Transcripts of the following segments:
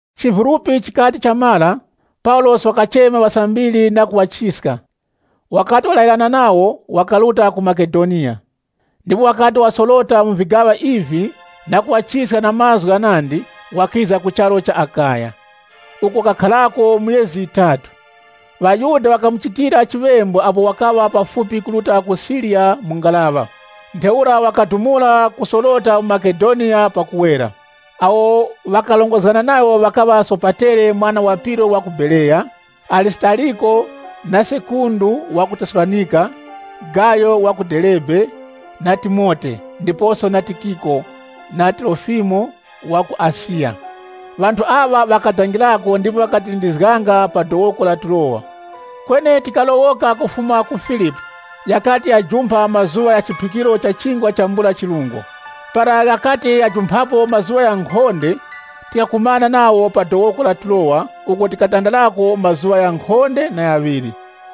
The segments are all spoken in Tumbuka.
Chivulupi chikati chamara, Paulosi wakachema ŵasambiri na kuŵachiska. Wakati walayirana nawo, wakaruta ku Makedoniya. Ndipo wakati wasorota mu vigaŵa ivi na kuŵachiska na mazgu ghanandi, wakiza ku charu cha Akaya. Uko wakakharako myezi yitatu. ŴaYuda ŵakamuchitira chiŵembu apo wakaŵa pafupi kuruta ku Siriya mu ngaraŵa. Ntheura wakadumula kusorota mu Makedoniya pakuwera. Awo ŵakarongozgana nayo ŵakaŵa Sopatere mwana wa Piro, wa ku Bereya, Arisitariko, na Sekundu ŵa ku Tesalonika, Gayo wa ku Derebe, na Timote, ndiposo Tikiko, na Trofimo wa ku Asiya. Ŵanthu aŵa ŵakadangirako ndipo ŵakatilindizganga pa dowoko la Turowa. Kweni tikalowoka kufuma ku Filipi, ghakati ghajumpha mazuŵa gha chiphikiro cha Chingwa chambula chirungo. Para ghakati ghajumphapo mazuŵa ghankhonde, tikakumana nawo pa dowoko la Turowa uko tikatandarako mazuŵa ghankhonde na ghaŵiri.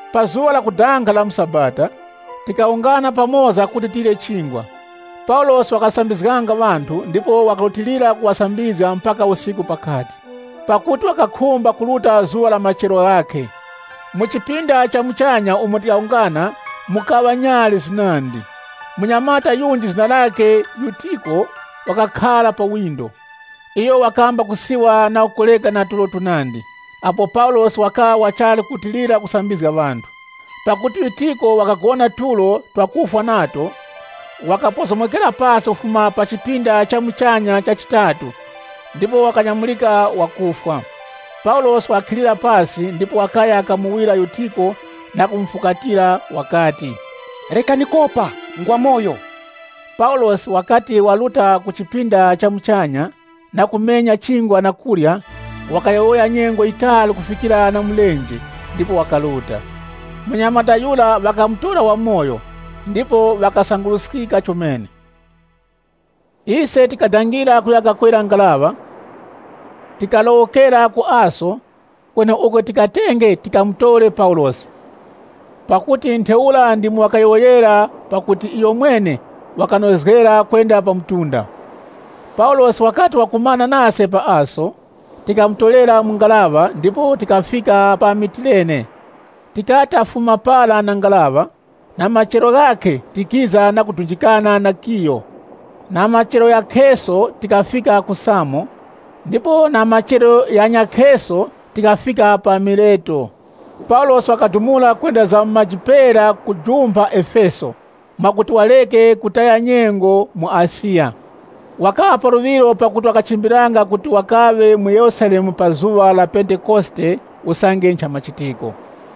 Pa zuŵa lakudanga la mu sabata, tikawungana pamoza kuti tirye Chingwa. Paulosi wakasambizganga ŵanthu, ndipo wakarutilira kuŵasambizga mpaka usiku pakati. Pakuti wakakhumba kuruta zuŵa la machero ghakhe. Mu chipinda cha muchanya umo tikawungana mukaŵa nyali zinandi. Munyamata yunji zina lakhe Yutiko wakakhara pa chidangazi. Iyo wakamba kusiwa na kukoreka na tulo tunandi, apo Paulosi wakaŵa wachali kurutilira kusambizga ŵanthu. Pakuti Yutiko wakagona tulo tuzitu, wakapozomokera pasi kufuma pa chipinda cha muchanya cha chitatu ndipo wakanyamurika wakufwa. Paulosi wakakhilira pasi ndipo wakaya kamuwira Yutiko na kumufukatira, wakati, “Rekani kopa, ngwamoyo!” Paulosi wakati waruta ku chipinda cha muchanya na kumenya chingwa na kurya, wakayowoya nyengo yitali kufikira na mulenje ndipo wakaruta. Munyamata yura ŵakamutora wamoyo, ndipo ŵakasanguruskika chomene. Ise tikadangira kuya kakwera ngaraŵa, tikalowokera ku Aso, kweneuko tikatenge tikamutore Paulosi. Pakuti ntheura ndimo wakayowoyera pakuti iyomwene wakanozgera kwenda pa mtunda. Paulosi wakati wakumana nase pa Aso, tikamutorera mu ngaraŵa ndipo tikafika pa Mitilene. Tikati tafuma para na ngaraŵa, na machero ghakhe tikiza na kudunjikana na Kiyo. Na machero ghakheso tikafika ku Samo, ndipo na machero ghanyakheso tikafika pa Mileto. Paulosi wakadumula kwenda za mu maji pera kujumpha Efeso, mwakuti wareke kutaya nyengo mu Asiya. Wakaŵa pa luŵiro pakuti ŵakachimbiliranga kuti wakaŵe mu Yerusalemu pa zuŵa la Pentekosite usange nchamachitiko.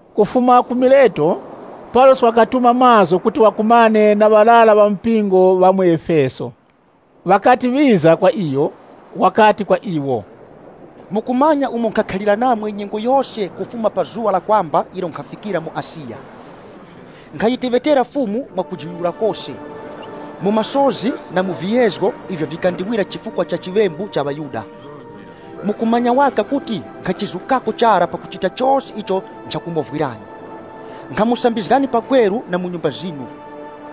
Kufuma ku Mileto, Paulosi wakatuma mazgu kuti wakumane na ŵarara ŵa mu mpingo wa mu Efeso. Ŵakati ŵiza kwa iyo, wakati kwa iwo, “Mukumanya umo nkhakhalira namwe nyengo yose kufuma pa zuŵa lakwamba ilo nkhafikira mu Asiya. Nkhayiteŵetera Fumu mwa kujiyuyura kose, mu masozi na mu viyezgo ivyo vikandiwira chifukwa cha chiŵembu cha ŵaYuda. Mukumanya waka kuti nkhachizukako chara pakuchita chose icho nchakumovwirani. Nkhamusambizgani pakweru na mu nyumba zinu.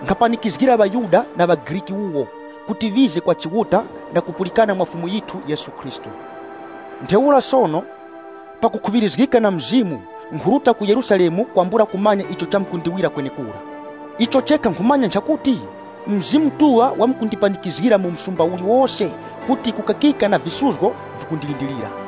Nkhapanikizgira ŵaYuda, na ŵaGriki wuwo, kuti ŵize kwa Chiuta, na kupulikana mwa Fumu yithu Yesu Khristu. Ntheura sono, pakukhuŵirizgika na Mzimu, nkhuruta ku Yerusalemu kwambula kumanya icho chamkundiwira kwenekura. Icho chekha nkhumanya nchakuti, Mzimu Mutuŵa wakundipanikizgira mu msumba uliwose kuti kukakika na visuzgo vikundilindirira.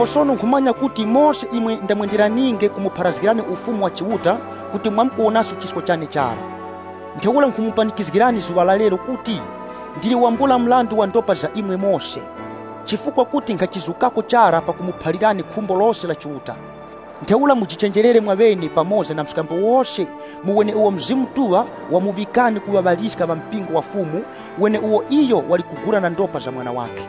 “Sono nkhumanya kuti mose imwe ndamwenderaninge kumupharazgirani Ufumu wa Chiuta kuti mwamkuwonaso chisko chane chara. Ntheura nkhumupanikizgirani zuŵa la lero kuti, ndili wambula mrandu wa ndopa za imwe mose. Chifukwa kuti nkhachizukako chara pakumuphalirani khumbo lose la Chiuta. Ntheura mujichenjerere mwaŵene pamoza na mskambo wose mu weneuwo Mzimu Mutuŵa wamuŵikani kuŵa ŵaliska ŵa mpingo wa Chiuta, weneuwo iyo wali kugula na ndopa za Mwana wakhe.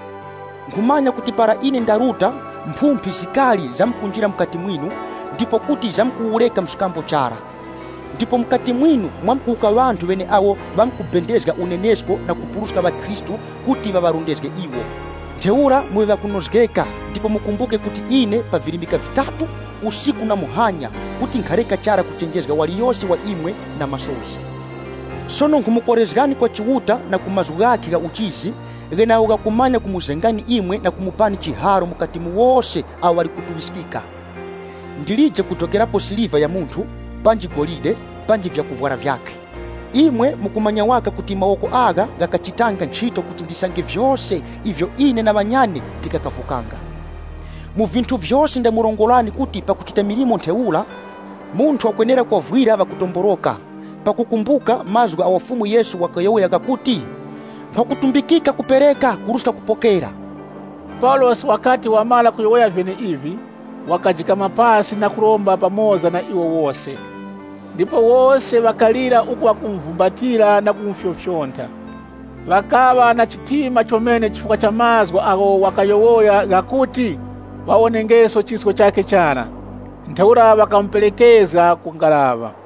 Nkhumanya kuti para ine ndaruta, mphumphi zikari zamkunjira mukati mwinu, ndipo kuti zamkuwureka mskambo chara. Ndipo mukati mwinu mwamkuwuka ŵanthu ŵeneawo ŵamkubendezga unenesko na kupuruska ŵakhristu kuti ŵaŵarondezge iwo. Ntheura muŵe ŵakunozgeka ndipo mukumbuke kuti ine, pa virimika vitatu, muhanya na usiku kuti nkhareka chara kuchenjezga waliyose wa imwe na masozi. “Sono nkhumukorezgani kwa Chiuta na ku mazgu ghakhe gha uchizi, gheneagho ghakumanya kumuzengani imwe na kumupani chiharo mukati mu wose awo ŵali kutuŵiskika. Ndilije kudokerapo siliva ya munthu panji golide panji vyakuvwara vyakhe. Imwe mukumanya waka kuti mawoko agha ghakachitanga nchito kuti ndisange vyose ivyo ine na ŵanyane tikakavukanga. Mu vinthu vyose ndamurongorani kuti pakuchita milimo ntheura, munthu wakwenera kovwira ŵakutomboroka, pakukumbuka mazgu agho Fumu Yesu wakayowoya ghakuti, ‘Nkhwakutumbikika kupereka kuruska kupokera.’” Paulosi wakati wamara kuyowoya vyeneivi, wakajikama pasi na kuromba pamoza na iwo wose. Ndipo wose ŵakalira uku ŵakumuvumbatira na kumufyofyontha. Ŵakaŵa na chitima, chomene chifukwa cha mazgu agho wakayowoya ghakuti ŵawonengeso chisko chakhe chara. Ntheura ŵakamuperekezga ku ngaraŵa.